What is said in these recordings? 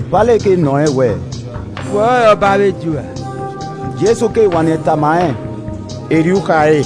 Pailet keghi nọ rẹn wẹẹ, “Wẹ ọrọre ọba avbe Ju ra?” Jesu wanniẹn tama rẹn, “Erriọ u kha re.”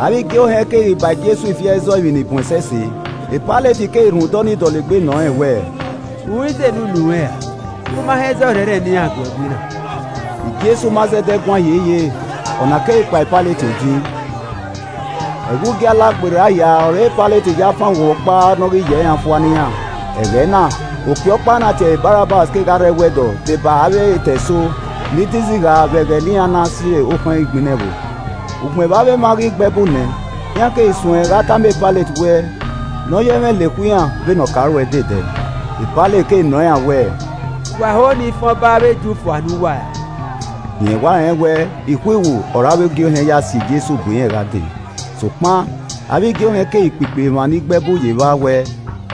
Avbe igie ohẹn keghi ba Jesu ifi ẹzọ emwi ni bun ẹsẹse. Pailet keghi rhunmwuda ọnii dọlegbe nọ rẹn wẹẹ, “U i zẹ ene unu ruẹn ra? U ma họn ẹzọ ọrhẹnrhẹn ne iran gu ẹe gui na!” Jesu ma zẹdẹ guan hiehiere. Ọna keghi kpan e Pailet odin. Ẹghẹ Ugie Alagberra hia ọre Pailet ya fan oghunmwu ọkpa ne ọ ghi yẹ iran fua ne iran. Ẹghẹ na, okpia ọkpa ne a tie ẹre Barabbas kegha rre ẹwẹdọ deba avbe etẹ eso ni de izigha vbe ẹghẹ ne iran na si okhọn igbinna ẹvbo. Ugbẹn vbe avbe emwa ghi gbe ẹbu nẹ, iran keghi suẹn gha tama Pailet wẹ nọ ya ẹmwẹ lekhue iran vbene ọ ka ruẹe de ẹdẹ. Pailet keghi nọ iran wẹẹ, “Wa ho ne I fan ọba avbe Ju fua ne uwa ra?” Rẹn wa rẹn wẹ ikhuiwu ọre avbe igie ohẹn ya si Jesu bu irẹn gha dee. Sokpan avbe igie ohẹn keghi kpikpi emwa ni gbe ẹbu ye evba wẹ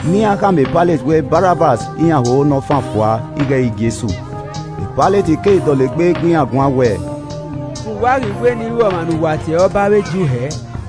ne iran kha ma Pailet wẹ Barabbas iran ho ne ọ fan fua ighẹ ẹ i re Jesu. Pailet keghi dọlegbe gu iran guan wẹẹ, “Vbe uwa ghi wẹ ne I ru ọmwa ne uwa tie ẹre ọba avbe Ju hẹẹ?”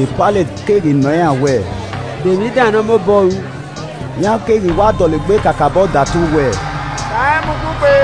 Pailet keghi nọ iran wẹẹ, “De emwi dan ne ọ mobọ ru?” Iran keghi wa dọlegbe kakabọ datu wẹẹ, “Kan rẹn mu ugbugbe.”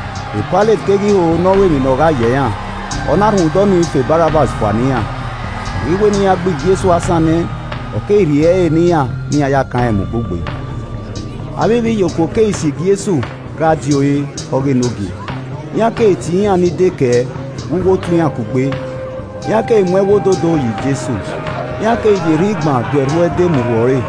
Pailet keghi ho ne ọ ru emwi ne ogha yẹ iran, ọ na rhunmwuda ọnii fan Barabbas fua ne iran. Ọ ghi wẹ ne iran gbe Jesu asan nẹ, ọ keghi rhie ẹre ne iran ne iran ya kan rẹn mu ugbugbe. Avbe ivbiyokuo keghi si Jesu gha die ore (ọ ghe Enogie), iran keghi tie iran ni dekẹe vbe uwu otu iran kugbe. Iran keghi mu ẹwu ododo yọ Jesu, iran keghi ya erhan igban do erhu ẹde mu rhuẹ ọre.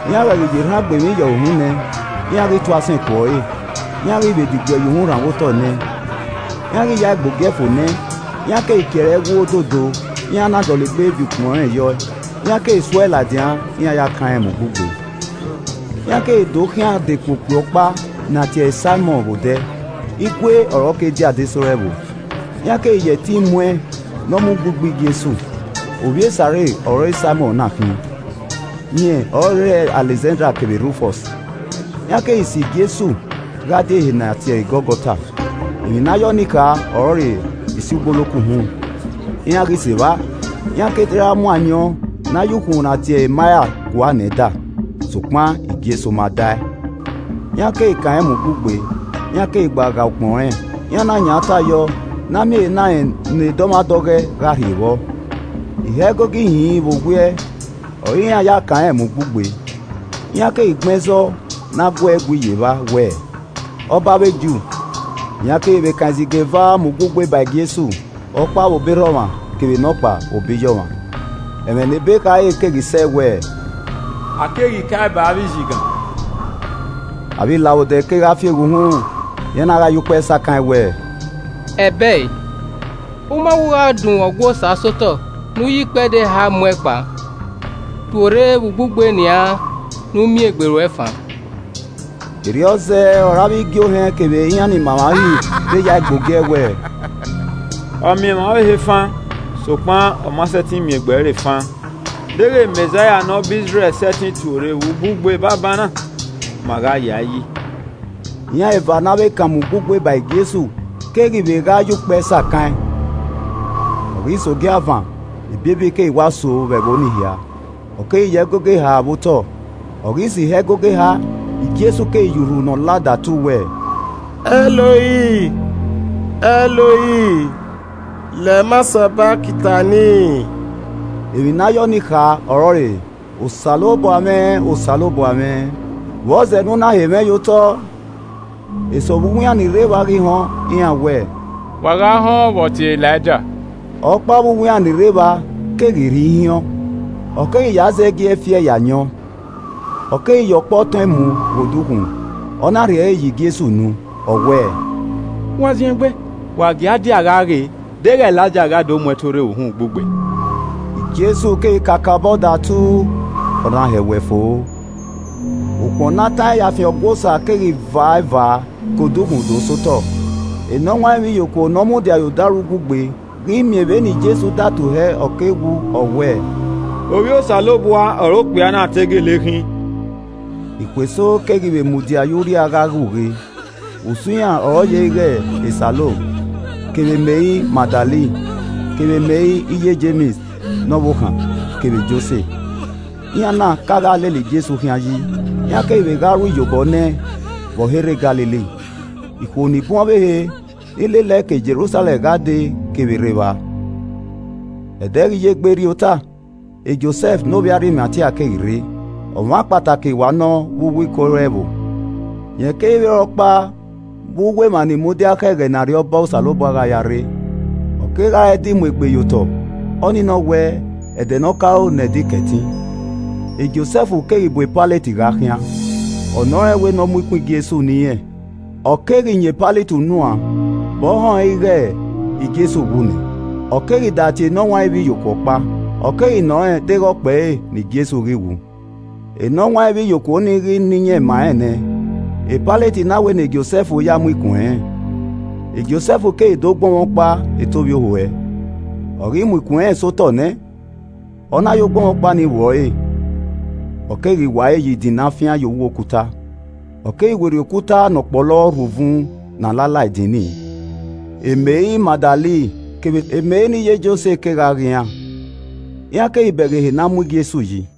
Iran ghẹ ghi ya erhan gbe emwi ye ọre uhunmwu nẹ, iran ghi tu asẹn ku ọre, iran ghi vbe diguẹ ye uhunmwu rhanmwẹ otọ nẹ ẹn. Iran ghi ya ẹe gbe ogie fo nẹ, iran keghi kie ẹre ẹwu ododo, iran na dọlegbe viọ ukpọn irẹn yọe. Iran keghi su ẹe ladian ne iran ya kan rẹn mu ugbugbe. Iran keghi do khian dekun okpia ọkpa ne a tie ẹre Saimọn vbe odẹ, igue ọ re ọ ke die adesẹ ore ẹvbo, iran keghi ya ẹtin mu ẹn ne ọ mu ugbugbe Jesu. (Ovbi e Sairin ọre Saimọn na khin, rẹn ọ re erha Alẹkzanda kevbe Rufọs.) Iran keghi si Jesu gha die ehe ne a tie ẹre Gọlgọta (emwi ne a ye ọnii kha ọrọre Isi Ugboloko Uhunmwu). Iran ghi sẹ evba, iran keghi te ra mu ayọn ne a ye ukhunmwu ne a tie ẹre maia gua nẹ ẹn da, sokpan Jesu ma da e. Iran keghi kan rẹn mu ugbugbe, iran keghi gba ghae ukpọn rẹn, iran na yan uta yọ ne a miẹn ehe na rẹn ne dọmwadẹ ọghọe gha rhie vbọ. Ihe ẹgogo ihinrin vbe owiẹ ọre irẹn ya kanrẹn mu ugbugbe. Iran keghi gbẹn ẹzọ ne a gu ẹe gui ye evba wẹẹ, “Ọba avbe Ju.” Iran keghi vbe kan izigan eva mu ugbugbe ba Jesu, ọkpa vbe obọ erha ọmwa, kevbe nọkpa vbe obọ iye ọmwa. [ Ẹmwẹ ne ebe khare keghi sẹ wẹẹ, “A keghi kae ba avbe izigan.”] Avbe ilavbodẹ kegha fieghe uhunmwu, iran na gha ya ukpẹ sakan ẹn wẹẹ, “Ẹbẹe, U ma wẹ u gha dunmwu Ọgua Osa sẹ otọ ne u ya ikpẹdẹ eha mu ẹn kpa! Tuorre vbe ugbugbe nian ne u miẹn egbe ruẹ fan!” Erriọ zẹẹ ọre avbe igie ohẹn kevbe iran ni ma emwa Uhi vbe ya ẹe gbe ogie wẹẹ, “Ọ miẹn emwa ọvbehe fan, sokpan ọ ma sẹtin miẹn egbe ẹre fan. Deghẹ Mẹzaia ne ọba Izrẹl sẹtin tuorre vbe ugbugbe banbanna, ma gha ya ẹe yi.” Iran eva ne a vbe kan mu ugbugbe ba Jesu keghi vbe gha ya ukpẹ sakan ẹn. Ọ ghi sẹ ogiavan, ebiebi keghi wa so vbe ẹvbo ni hia, ọ keghi ya ẹgogo eha vbe otọ. Ọ ghi sẹ ihe ẹgogo eha, Jesu keghi ya urhu ne ọ la datu wẹẹ, “Ẹloi, Ẹloi, lema sabachthani?” Emwi ne a ya ọnii kha ọrọre “Osanobua mwẹ, Osanobua mwẹ, vbe ọ zẹ ne u na he mwẹ ye otọ?” Eso vbe uwu iran ni rre evba ghi họn, iran wẹẹ, “Wa gha họn vbe ọ tie Elaija.” Ọkpa vbe uwu iran ni rre evba keghi rhie ihiọn, ọ keghi ya zẹgiẹ fi ẹe ye ayọn, ọ keghi ya ọkpọ tọn ẹn mu ghe odukhunmwu, ọ na rhie ẹre ye Jesu unu, ọ wẹẹ, “Wa zin egbe, wa gie a dia gha ghe deghẹ Elaija gha do mu ẹn tuorre vbe uhunmwu ugbugbe.” Jesu keghi kakabọ datu, ọ na hẹwẹ fo. Ukpọn ne a tan ẹn ya fian ọgua Osa keghi va eva ke ukhunmwu do sẹ otọ. Enọwanrẹn ivbiyokuo ne ọ mudia ye odaro ugbugbe ghi miẹn vbene Jesu datu hẹ ọ ke wu, ọ wẹẹ, “Ovbi Osanobua ọre okpia na te gele khin.” Ikhuo eso keghi vbe mudia ye urria gha ghe ughe. Usun iran ọre ọ ye ighe Salomẹ, kevbe Meri Magdalen kevbe Meri iye Jems ne ọvbokhan kevbe Jose. Iran na ka gha lele Jesu khian yi, iran keghi vbe gha ru iyobọ nẹ ẹn vbe ọ he rre Galili. Ikhuo ni bun ọvbehe ni lele ẹe ke Jerusalẹm gha dee kevbe rre evba. Ẹdẹ ghi ya egbe rrie ota, Josẹf ne ovbi Arimatia keghi rre. Ọmwa kpataki wa nọ vbe uwu Iko ore ẹvbo. Rẹn keghi vbe re ọkpa vbe uwu emwa ni mudia khẹ ẹghẹ ne Arriọba Osanobua gha ya rre. Ọ kegha re ẹdẹ Imuegbe ye otọ (ọnii nọ wẹ, ẹdẹ ne ọ ke aro ne Ẹdẹ Ikẹtin); Josẹf keghi bu Pailet gha khian, ọ nọ rẹn wẹ ne ọ mu ikun Jesu ne irẹn. Ọ keghi yan Pailet unu an vbe ọ họn ẹn ighe Jesu wu nẹ. Ọ keghi datie enọwanrẹn ivbiyokuo ọkpa, ọ keghi nọ rẹn deghẹ ọ kpẹre ne Jesu ghi wu. Enọwanrẹn ivbiyokuo ni ghi na iyẹn ma rẹn nẹ, Pailet na wẹ ne Josẹf ya mu ikun ẹnrẹn. Josẹf keghi dẹ ogbọnmwọkpa eto ovbiohuẹ, ọ ghi mu ikun ẹnrẹn sẹ otọ nẹ, ọ na ye ogbọnmwọkpa ni vbuẹ ọre, ọ keghi wa ẹre ye idin ne a fian ye uwu okuta, ọ keghi werriẹ okuta ne ọ kpọlọ rhu uvun ne a la la idin ni. Meri Magdalen kevbe Meri ne iye Jose kegha ghe iran, iran keghi bẹghe ehe ne a mu Jesu yi.